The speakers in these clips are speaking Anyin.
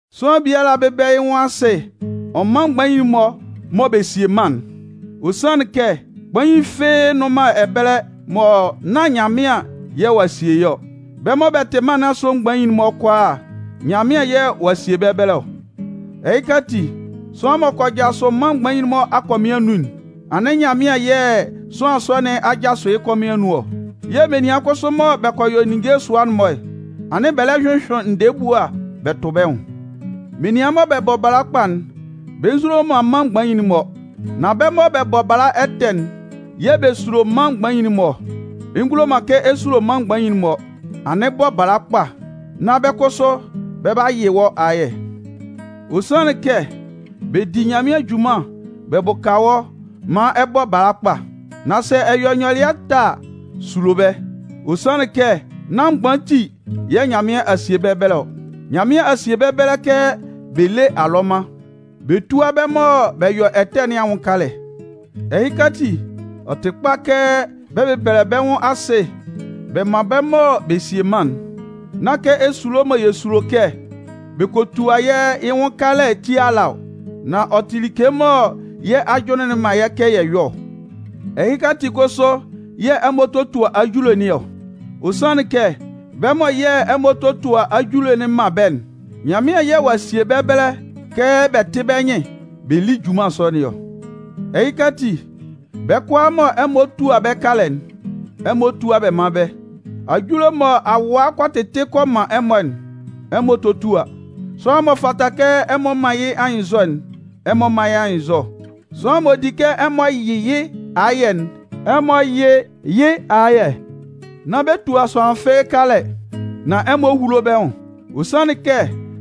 Sʋanlan biala bɛ́bɛlɛ yɩ́ nwʋn asɩ ɔ mán mgbain'n-mɔ mɔ bɛ sie mân'n. Ɔ sanlɩn kɛ kpain fɩ́ɩ́ nnʋn man ɛbɛlɛ mɔ nán Nyanmɩan yɛ̂ ɔ'a sie yɩ́ ɔ. Bɛ́ mɔ bɛ tɩ mân nɩn asʋ mgbain'n-mɔ kʋalaa, Nyanmɩan yɛ̂ ɔ'a sie bɛ́ ɛbɛlɛ ɔ. Ɛhɩka ati, sʋanlan m'ɔ kɔ jasʋ mân mgbain'n-mɔ akɔmɩn anun'n, anɩn Nyanmɩan yɛ̂ sʋanlan sɔ nɩn a jasʋ yɩ́ kɔmɩn anun ɔ. Yɛ̂ menian kʋsʋ mɔ bɛ yɔ ninnge sʋa-mɔ'n, anɩn bɛ lɛ hyʋhyʋɩn ndɛɛ ebua bɛ tʋ bɛ́ nwʋn. Menian mɔ bɛ bɔ bala kpa'n, bɛ nzulo man mân mgbain'n-mɔ. Nan bɛ́ mɔ bɛ bɔ bala ɛtɛ'n yɛ̂ bɛ sulo mân mgbain'n-mɔ ɔ. Ɛ ngulo man kɛ ɛ sulo mân mgbain'n-mɔ, anɩn bɔ bala kpa, nán bɛ́ kʋsʋ bɛ 'ba yɩ wɔ́ ayɛ. Ɔ sanlɩn kɛ bɛ di Nyanmɩan junman bɛ bʋka wɔ́ maan ɛ bɔ bala kpa. Nan sɛ ɛ yɔ ɛtɛ a, sulo bɛ́. Ɔ sanlɩn kɛ nán mgban ati yɛ̂ Nyanmɩan a sie bɛ́ ɛbɛlɛ ɔ. Nyanmɩan a sie bɛ́ ɛbɛlɛ kɛ bɛ lé alɔman, bɛ túa bɛ́ mɔ bɛ yɔ ɛtɛ nɩn anwʋn kalɛ. Ɛhɩka ati, ɔ tɩ kpa kɛ bɛ bɛ́bɛlɛ bɛ́ nwʋn asɩ bɛ mán bɛ́ mɔ bɛ sie mân'n. Nán kɛ esulo mɔ yɛ sulo kɛ bɛ kɔ tua yɛ́ yɩ́ nwʋn kalɛ ti ala ɔ, nan ɔ tɩ like mɔ yɛ́ ajʋnlɩn'n man yɛ́ kɛ yɛ yɔ́ ɔ. Ɛhɩka ati kʋsʋ yɛ̂ ɛmɔ totua ajule nɩn ɔ. Ɔ sanlɩn kɛ bɛ́ mɔ yɛ̂ ɛmɔ totua ajule'n man bɛ́'n, Nyanmɩan yɛ̂ ɔ'a sie bɛ́ ɛbɛlɛ kɛ bɛ tɩ́ bɛ́ nyɩn bɛ lí junman sɔ nɩn ɔ. Ɛhɩka ati, bɛ́ kʋalaa mɔ ɛmɔ tua bɛ́ kalɛ'n, ɛmɔ túa bɛ mán bɛ́. Ajule mɔ awaa kɔ tɩtɩ kɔ man ɛmɔ'n, ɛmɔ tótua. Sʋanlan m'ɔ fata kɛ ɛmɔ man yɩ́ anyɩnnzɔ'n, ɛmɔ mán yɩ́ anyɩnnzɔ. Sʋanlan m'ɔ di kɛ ɛmɔ yɩ yɩ́ ayɛ'n, ɛmɔ yɩ́ yɩ́ ayɛ. Nán bɛ tua sʋanlan fɩ́ɩ́ kalɛ, nan ɛmɔ húlo bɛ́ nwʋn. Ɔ sanlɩn kɛ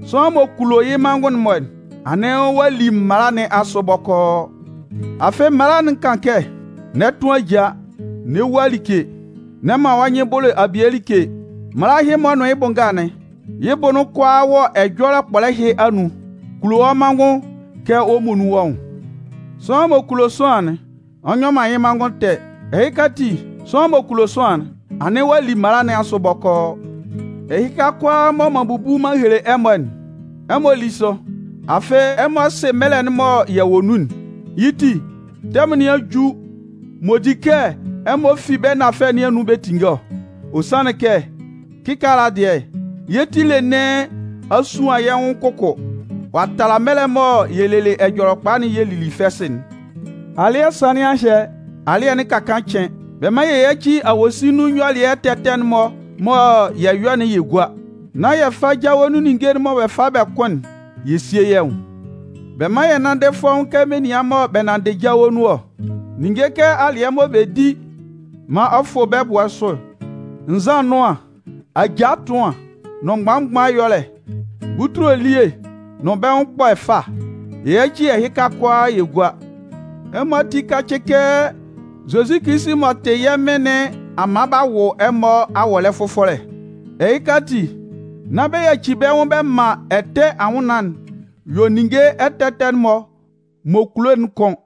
sʋanlan m'ɔ kulo yɩ́ manngʋn-mɔ'n, anɩn ɔ'a li mala nɩn asʋ bɔkɔɔ. Afɩ mala'n kan kɛ: N'ɛ tʋn ajaa, n'ɛ wua like, n'ɛ man wɔ́ nyɩn bʋlʋ abie like. Mala ɛhɩ-mɔ nʋn yɩ́ bʋ nga'n, yɩ́ bʋ'n kʋalaa wɔ ɛjɔlɛ kpɔlɛ ɛhɩ anun: Kulo wɔ́ manngʋn kɛ wɔ́ muonun wɔ́ nwʋn. Sʋanlan m'ɔ kulo sʋanlan'n, ɔ nyɔ man yɩ́ manngʋn ɛtɛ. Ɛhɩka ati, sʋanlan m'ɔ kulo sʋanlan'n, anɩn ɔ'a li mala nɩn asʋ bɔkɔɔ. Ɛhɩka kʋalaa mɔ m'an bubu m'an hele ɛmɔ'n, ɛmɔ lí sʋ. Afɩ ɛmɔ sɩ mɛlɛ'n mɔ yɛ wɔ nun'n. Yɩ́ ti, tɛmʋn nɩn a ju m'ɔ di kɛ ɛmɔ fi bɛ́ nafɛlɛ nɩn anun bɛ tinnge ɔ. Ɔ sanlɩn kɛ, kɩkaala dɩɛ, yɛ́ ti ele nɩn a suan yɛ́ nwʋn kʋkʋ ɔ'a tala mɛlɛ mɔ yɛ lelɩ Ɛjɔlɛkpa'n yɛ lili fɛsɩ'n. Alɩ́ɛ sanlɩn a hyɛ, alɩ́ɛ'n ka kaan cɩn. Bɛ́ mán yɛ yáci awosin nun nyɔlɩɛ ɛtɛ ɛtɛ'n-mɔ mɔ yɛ yɔ'n yɛ gúa, nán yɛ fá jawe nun ɛlɔɛ ninnge'n-mɔ mɔ bɛ fa bɛ kʋn'n yɛ síe yɛ́ nwʋn. Bɛ mán yɛ nánndɩ fɔ́ʋ́n kɛ menian mɔ bɛ nanndɩ jawe nun ɔ. Ninnge kɛ alɩɛ mɔ bɛ di maan ɔ fʋ bɛ́ ɛbʋɛ sʋ, nzan ɛnʋan, ajaa ɛtʋan nʋn mgban mgban ɛyɔlɛ, butule elie nʋn bɛ́ nwʋn ɛkpɔ ɛfa, yɛ yáci ɛhɩka-mɔ kʋalaa yɛ gúa. Ɛmɔ ati kácɩ kɛ Zozi Kilisi m'ɔ tɩ yɛ́ Mɩn nɩn a man b'a wʋ ɛmɔ awɔlɛ fʋfɔlɛ. Ɛhɩka ati, nán bɛ yacɩ bɛ́ nwʋn bɛ man ɛtɛ anwʋnnaan'n yɔ ninnge ɛtɛ ɛtɛ'n-mɔ m'ɔ kulo'n kʋ́n.